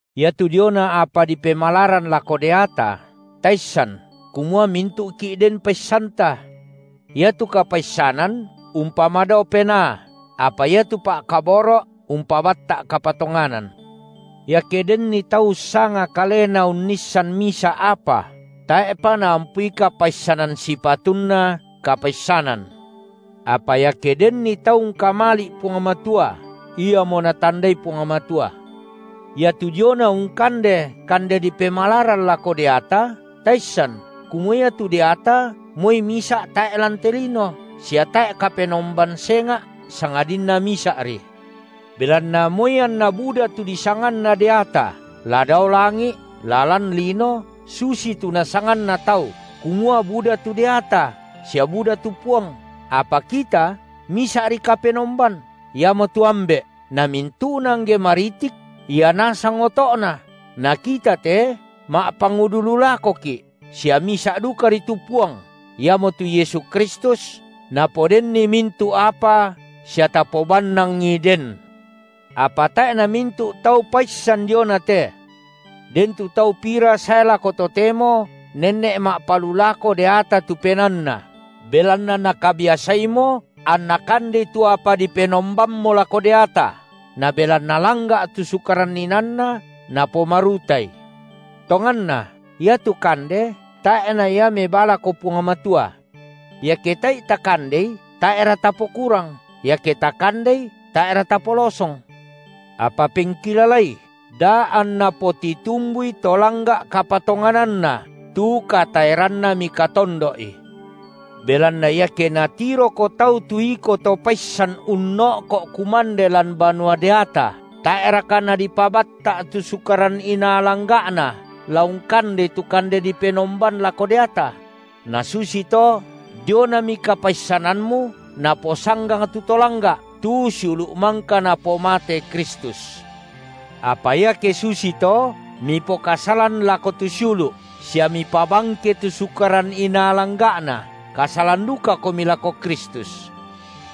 Iatu diona apa dipemalaran lako deata, taissan kumua mintu’ki’ den paissanta. Iatu kapaissanan umpamadao penaa, apa iatu pa’kaboro’ umpabatta’ kapatonganan. Iake denni tau ussanga kalena unnissan misa’ apa, tae’pa naampui kapaissanan sipatunna kapaissanan. Apa iake denni tau ungkamali’ Puang Matua, iamo Natandai Puang Matua. Iatu diona ungkande kande dipemalaran lako deata, taissan kumua iatu deata moi misa’ tae’ lan te lino, sia tae’ kapenomban senga’ sangadinna Misa’ri. Belanna moi anna buda tu disanganna deata, la dao langi’, la lan lino, susitu nasanganna tau kumua buda tu deata sia buda tu puang, apa kita, Misa’ri Kapenomban, iamotu Ambe’, namintu’na angge maritik Ia nasang oto’na, na kita te ma’pangudu lu lakoki’, sia misa’ dukari tu Puang, iamotu Yesu Kristus, napodenni mintu’ apa sia tapobannangI den. Apa tae’ namintu’ tau paissan dionate. Den tu tau pira sae lako totemo nenne’ ma’palulako deata tu penaanna, belanna nakabiasaimo anna kandei tu apa dipenombammo lako deata, na belanna langga’ tu sukaran inaanna, napomarutai. Tonganna iatu kande tae’na ia mebaa lako Puang Matua. Iake tae’i takandei, tae’ra tapokurang, iake takandei tae’ra tapolosong. Apa pengkilalai, da anna potitumbui to langga’ kapatongananna tu kataeranna mikatondo’i. Belanna iake natiroko tau tu iko to paissan unno’ko kumande lan banua deata tae’raka nala dipabatta’ tu sukaran inaa langga’na la ungkandei tu kande dipenomban lako deata? Na susito dionami kapaissanammu naposanggang tu to langga’, tu siulu’ mangka Napomate Kristus. Apa iake susito mipokasalan lako tu siulu’, sia mipabangke tu sukaran inaa langga’na, kasalan dukakomi lako Kristus.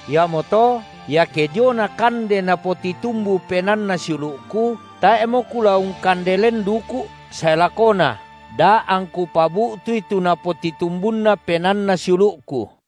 Iamoto iake diona kande napotitumbu penaanna siulu’ku, tae’mo kula ungkande len duku’ sae lakona, da angku pabu’tui tu napotitumbunna penaanna siulu’ku.